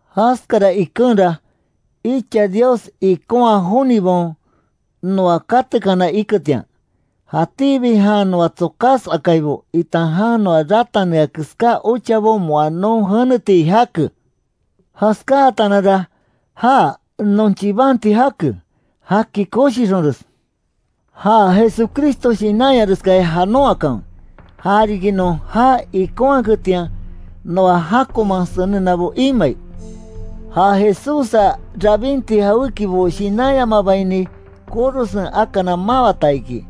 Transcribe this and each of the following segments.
Jaskara ikenra, icha Dios ikonha jonibaon noa katekana iketian, jatíbi jan noa tsokas akaibo, itan jan noa ratanea keská ochabo moa non jeneti jake. Jaskáatananra já non chibanti jake, jaki koshixonres. Ja Jesucristo shinanyareskaya janon akanwe, ja riki non já ikonhaketian, noa jákoman senenabo imai. Ja Jesússa rabinti jawékibo shinanyamabaini, korosen akana mawata iki,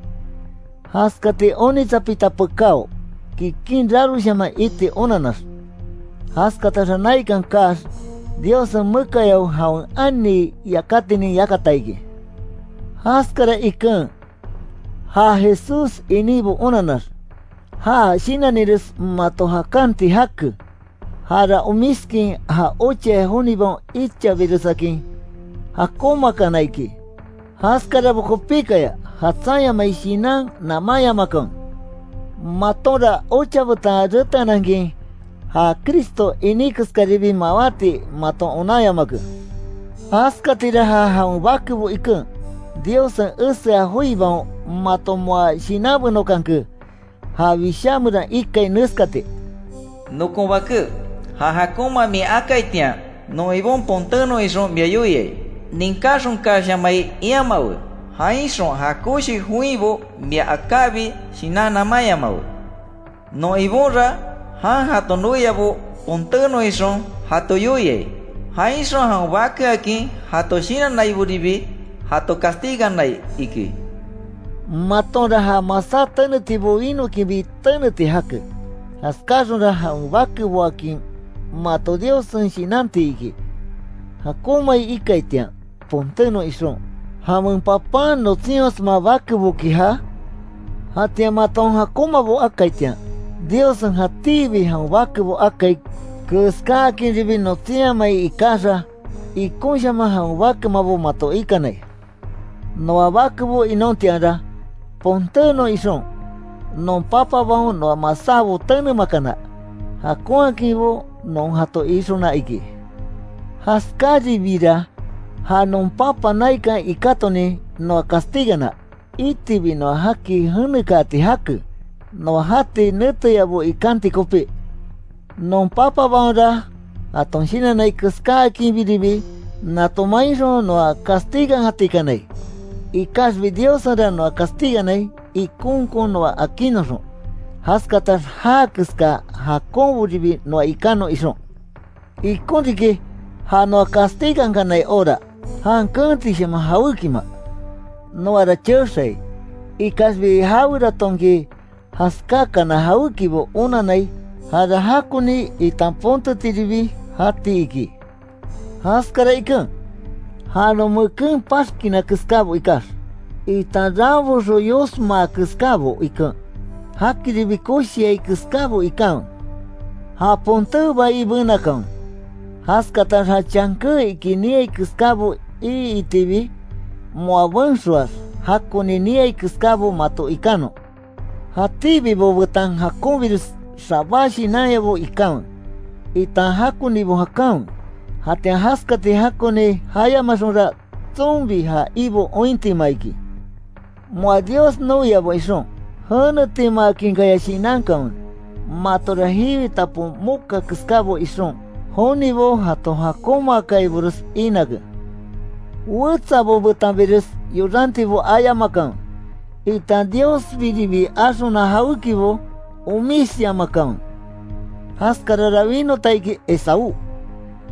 jaskati onitsapita pekáo, kikin raroshaman iti onannax. Jaskataxa naikan kaax, Diossen mekayao jawen ani yakatinin yakata iki. Jaskara iken ja Jesús iníbo onannax, ja shinannires mato jakanti jake, jara omiskin, ja ochaya jonibaon ichabiresakin jakonmaakana iki. Jaskarabo kopíkaya jatsanyamai shinan namanyamakanwe. Matonra, ocha betan reteanankin, ja Cristo iní keskatiribi mawati, maton onanyamake. Jaskatira, ja jawen bakebo iken, Diossen esea joibaon mato moa shinanbenokanke. Ja Wishá meran ikai neskati: “Nokon baké, ja jakonma min akaitian, non Ibon ponténon ixon mia yoia, ninkáxonkashamai iamawe, jainxon ja koshi joinbo mia akábi, shinan namányamawe. Non Ibonra, jan jato noiabo ponténon ixon jato yoiai; jainxon jawen bakeakin jato shinannaiboribi, jato castiganai”, iki. Matonra, ja masá tenetibo winókinbi teneti jake, jaskáxonra jawen bakeboakin mato Diossen shinanti iki. ¿Jakonmai ikaitian ponténon ixon, jawen papan notsinyosma bakeboki jaa? Jatian maton jakonmabo akaitian, Diossen jatíbi jawen bakebo akai keskáakinribi notsinhamai ikaxa, ikonkonshaman jawen bakemabo mato ikanai. Noa bakebo inontianra, ponténon ixon, non papabaon noa masábo tenemakana, jakonhakinbo non jato ixona iki. Jaskáribira, ja non Papa naikan ikátonin noa castigana, itibi noa jaki jenekaati jake, noa jati neteyabo ikanti kopí. Non papabaonra jaton shinannai keskáakinbiribi, nato mainxon noa castigankatikanai. Ikaxbi Diossenra noa castiganai, ikonkon noa akinnoxon, jaskatax já keska jakonboribi noa ikanon ixon. Ikon riki, ja noa castigankanai hora, jan keentishaman jawékima. Noara chexai, ikaxbi jaweratonki jaskákana jawékibo onannai, jara jakoni, itan pontetiribi jati iki. Jaskara iken, ja non meken paxkina keskábo ikax, itan ranboxo yosmaa keskábo iken, jakiribi koshiai keskábo ikanwe. Ja ponté bai benakanwe, jaskatax ja chanké iki niai keskábo iitibi, moa benxoax, jakoni niai keskábo, mato ikanon. Jatíbibo betan jakonbires xabá shinanyabo ikanwe, itan jakonibo jakanwe. Jatian jaskati jakoni jayamaxonra, tsonbi ja Ibo ointima iki. Moa Dios noiabo ixon, jenetimaakinkaya shinankanwe, matora jiwi tapon moka keskábo ixon, jonibo jato jakonmaakaibores inake. Wetsabo betanbires yorantibo ayamakanwe, itan Diosbiribi axona jawékibo omisyamakanwe. Jaskarara winota iki Esaú,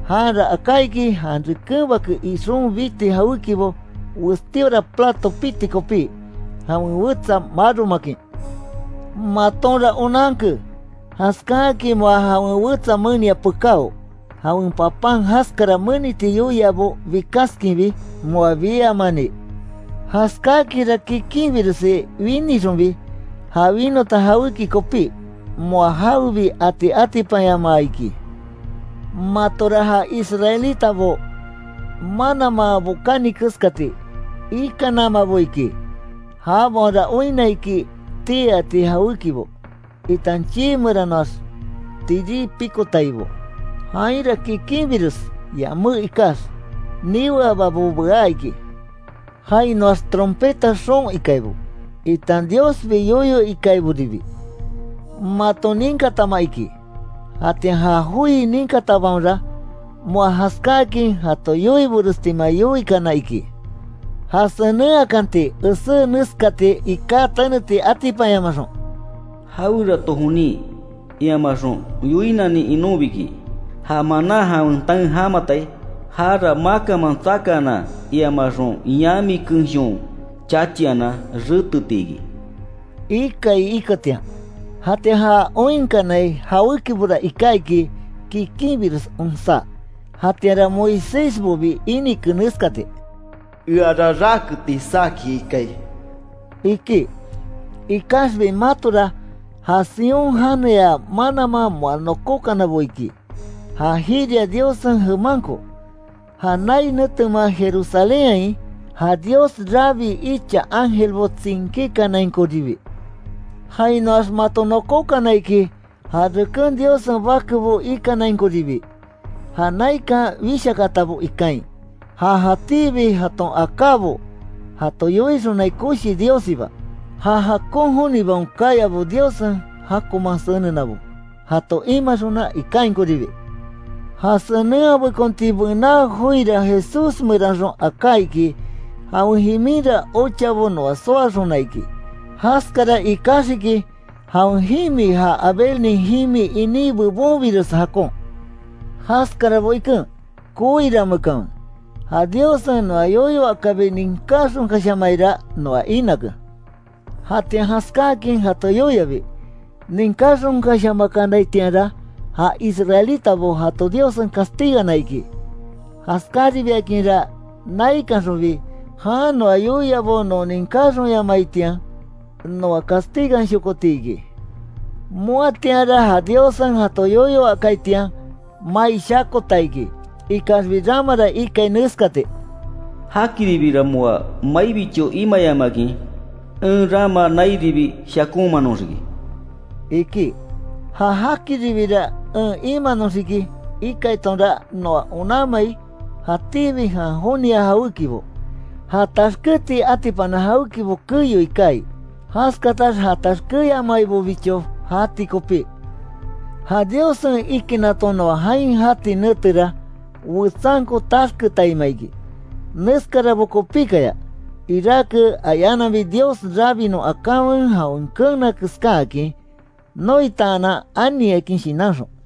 janra aká iki, jan reken bake ixon biti jawékibo, westíora plato piti kopi, jawen wetsa maromakin. Matonra onanke, jaskáakin moa jawen wetsa menia pekáo, jawen papan jaskara meniti yoiabo bikaskinbi, moa biamani. Jaskáakinra kikinbiresi winixonbi, ja winota jawéki kopí, moa jawebi ati atipanyamaa iki. Matora ja israelitabo mananman bokani keskati, ikanamabo iki. Jabaonra oinna iki, tii ati jawékibo, itan chii meranoax tirí pikotaibo, jainra kikinbires yamé ikax, niweababo bea iki. Jainoax trompeta xoon ikaibo, itan Diosbi yoyo ikaiboribi, maton ninkatama iki. Jatian ja joi ninkatabaonra, moa jaskáakin jato yoiborestima yoikana iki, ja senenhakanti esé neskati iká teneti atipanyamaxon: “Jawerato jonin, iamaxon yoinanin inonbiki, ja manan jawen taen jamatai, jara makanman tsakaanan, iamaxon yami kenshon chachianan reteti iki”, ikai iketian. Jatian ja oinkanai jawékibora iká iki, kikinbires onsá, jatianra Moisésbobi inike neskati: “Eara raketi saki ikai”, iki. Ikaxbi matora, ja Sión janeya mananman moa nokokanabo iki, ja jiria Diossen jemanko, ja nai netemea Jerusalénhain, ja Dios rabii icha ángelbo tsinkíkanainkoribi. Jainoax mato nokókana iki, ja reken Diossen bakebo ikanainkoribi, ja naikan wishakaatabo ikain, ja jatíbi jaton akábo jato yoixonai koshi Diossiba, ja jakon jonibaon kayabo Diossen jakonman senenabo, jato imaxona ikainkoribi. Ja senenhabekonti bená joira Jesús meranxon aká iki, jawen jiminra ochabo noa soaxona iki, jaskara ikaxiki, jawen jimi ja Abelnin jimi iní bebonbires jakon. Jaskarabo iken, koirameekanwe, ja Diossen noa yoyo akabi ninkáxonkashamaira, noa inake. Jatian jaskáakin jato yoiabi, ninkáxonkashamakanaitianra, ja israelitabo jato Diossen castigana iki. Jaskáribiakinra naikanxonbi, jan noa yoiabo non ninkáxonyamaitian, noa castiganshokoti iki. Moatianra ja Diossen jato yoyo akaitian, mai shakota iki, ikaxbi ramara ikai neskati: “Jakiribira moa maibicho imayamakin, en rama nairibi shakomanoxiki”, iki. Ja “jakiribira en imanoxiki”, ikaitonra noa onanmai, jatíbi jan jonia jawékibo, ja taxkéti atipana jawékibo keyoi kaai, jaskatax ja taxkéyamaibobicho jati kopí. Ja Diossen ikinnaton noa jain jati netera, wetsanko taxketaima iki. Neskarabo kopíkaya, iráke ayananbi Dios rabinon akanwe jawen keena keskáakin, noitaanan aniakin shinanxon.